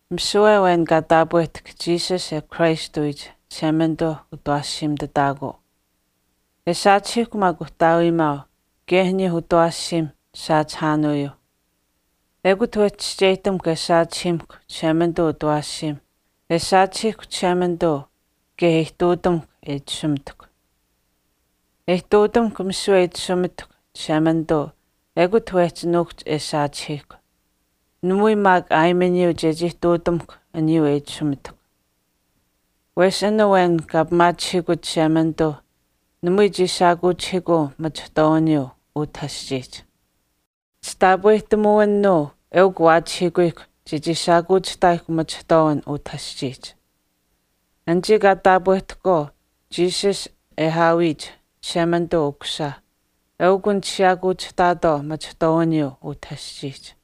Misiwe awen kaa taapwehtahk Jesus e aawiyich Christ Chishemanituuh utawaashiimitutaakuu. E saachihiihkw maak uhtaawiimaau kaye aniyuuh utawaashiimh chisaachihaanuyuuh. Ekut wehchi chischeyihtamuhkw e saachihiimuhkw Chishemanituu utawaashiim e saachihiihkw Chishemanituu kaye e ihtuutamuhkw e itashumitahkw. E ihtuutamuhkw misiwe e itashumitahkw Chishemanituu ekut wehchi nuukuhch e saachihiihkw. Namui maak aayimaniyuu chechii ihtuutamuhkw aniyuu e itashumitahkw. Wesh an awen kaa pimaachihiikut Chishemanituuh namui chii shaakuuchihiikuu machihtwaawiniyuu utah aschiihch. Chitaapwehtamuwinuu eukw waachihiikuyihkw chechii shaakuuchihtaayihkw machihtwaawin utah aschiihch. Anichii kaa taapwehtahkwaau Jesus e aawiyich Chishemanituu Ukusisa eukunich siyaakuuchihtaatwaau machihtwaawiniyuu utah aschiihch.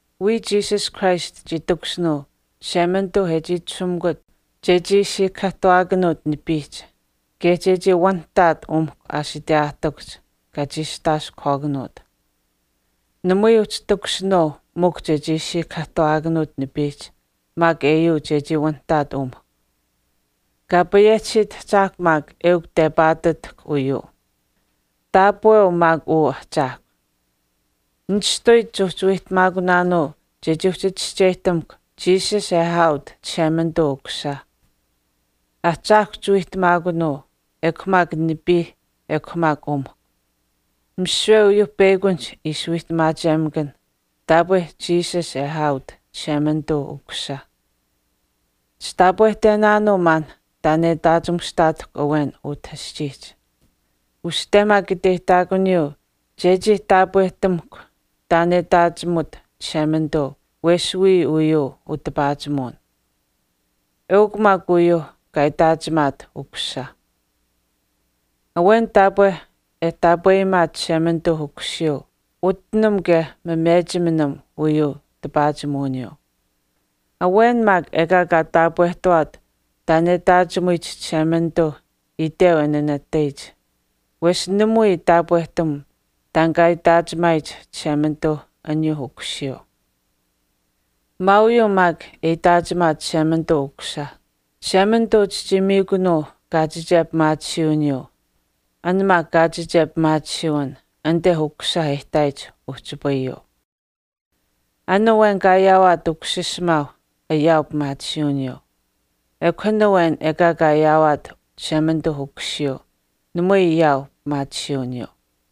Wiya Jesus Christ chii takushinuu Chishemanituu e chii itashumikut chechii siikahaahtuwaakanuut nipiihch, kaye chechii wanihtaat umihkw aashiteyaahtikuhch kaa chiistaaskuhwaakanuut. Namui uhchi takushinuu mikw chechii siikahaahtuwaakanuut nipiihch maak eyuu chechii wanitaat umihkw. Kaa payehchisiit Ahchaahkw maak eukw tepaatutahk uyuu. Taapweu maak uu Ahchaahkw. Nishtuyich chuuhchi wiihtamaakunaanuu chechii uhchi chischeyihtamuhkw Jesus e aaut Chishemanituu Ukusisa. Ahchaahkw chiwiihtamaakunuu, ekw maak nipiih ekw maak umihkw. Misiwe uyuuh peyakunihch ishi wiihtamaachemakanh taapwe Jesus e aaut Chishemanituu Ukusisa. Chitaapwehtenaanuu maan taan e itaachimushtaatahkw awen utah aschiihch. Uste maak iteyihtaakuniyuu chechii taapwehtamuhkw taan e itaachimut Chishemanituu wesh wiya uyuu utipaachimuwin. Eukw maak uyeyuu kaa itaachimaat Ukusisa. Awen taapwe e taapweyimaat Chishemanituu Ukusiyuu utinam kaye mamechiminam uyuu tipaachimuwiniyuu. Awen maak ekaa kaa taapwehtawaat taan e itaachimuyich Chishemanituuh itweu e nanatayich, wesh namui taapwehtam taan kaa itaachimaayich Chishemanituu aniyuuh Ukusiyuu. Mwaauyuu maak e itaachimaat Chishemanituu Ukusisa, Chishemanituu chichii miikunuu kaachiche pimaatisiiwiniyuu, an maak kaachiche pimaatisiiwin anite Ukusisa e ihtaayich uhchipayuu. An awen kaa ayaawaat Ukusiisimaau ayaau pimaatisiiwiniyuu. Ekw an awen ekaa kaa ayaawaat Chishemanituu Ukusiyuu namui ayaau pimaatisiiwiniyuu.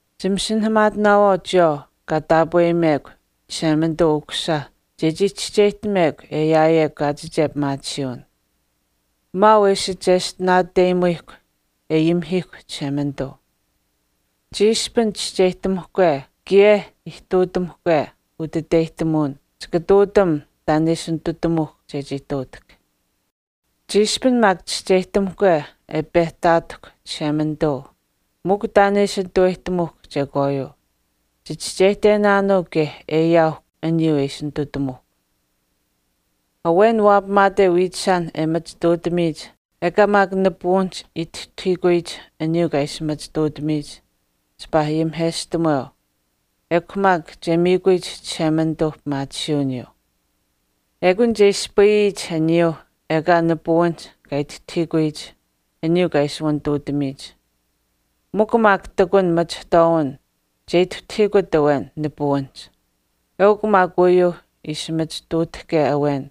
Chimasinahaamaatinaawaau chiyawaau kaa taapweyimekw Chishemanituu Ukusisa chechii chischeyihtamekw e ayaayekw kaachiche pimaatisiiwin. Mwaau e ishi cheshtinaateyimuyihkw e ayimihiihkw Chishemanituu. Chiishpin chischeyihtamuhkwe kaye ihtuutamuhkwe utiteyihtamuwin chika ihtuutam taan e ishi nitutamuuhkw chechii ihtuutahk. Chiishpin maak chischeyihtamuhke e pehtaatahkw Chishemanituu mikw taan e ishi nitutamuuhk chekwaayuu, chichischeyihtenaanuu kaye e ayaauhkw aniyuu e ishi nitutamuuhkw. Awen waapamaate wiichishaan e machituutamiyich ekaa maak nipuwinihch ituhtahiikuyich aniyuu kaa ishi machituutamiyich, chipaa ayimiheshtamuweu, ekw maak che miikuyich Chishemanituuh pimaatisiiwiniyuu. Eukun che ispayiyich aniyuuh ekaa nipuwinihch kaa ituhtahiikuyich aniyuu kaa ishi wanituutamiyich. Mikw maak ihtakun machihtwaawin che ituhtahiikut awen nipuwinihch. Uyuu maak ishi machituutahke awen,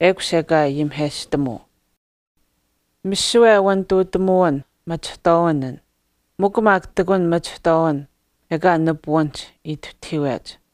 ekush ekaa ayimiheshtamuu. Misiwe wanituutamuwin, machihtwaawin an, mikw maak ihtakun machihtwaawin ekaa nipuwinihch ituhtahiiwech.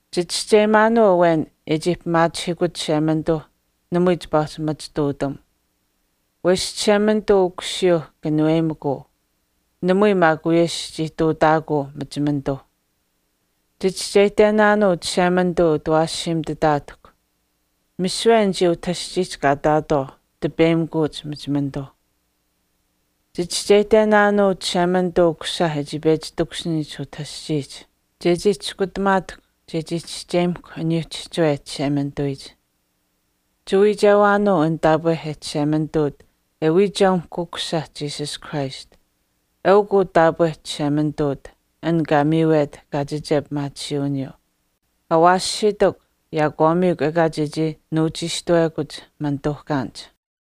Chichischeyimaanuu awen e chii pimaachihiikut Chishemanituuh namui chipaa uhchi machituutam. Wesh Chishemanituu Ukusiyuu kanuweyimikuu, namui maak wiyesh chii ihtuutaakuu machimanituuh. Chichischeyihtenaanuu Chishemanituu e utawaashiimituutaatahkw. Misiwe anichii utah aschiihch kaa ihtaatwaau tipeyimikuuch machimanituu. Chichischeyihtenaanuu Chishemanituu Ukusisa e chii pechi takushiniyich utah aschiihch, chechii chiskutamaatahkw chechii chischeyimahkw aniyuu chihchiwe Chishemanituwiyich. Chiwiichewaanuu an taapwe Cheshemanituut e wiicheumahk Ukusisa Jesus Christ. Eukw uu taapwe Cheshemanituut, an kaa miiwet kaachiche pimaatisiiwiniyuu. Awaashitikw, yaakwaamiikw ekaa chechii nuuchiishtuwekuch manituuhkaanich.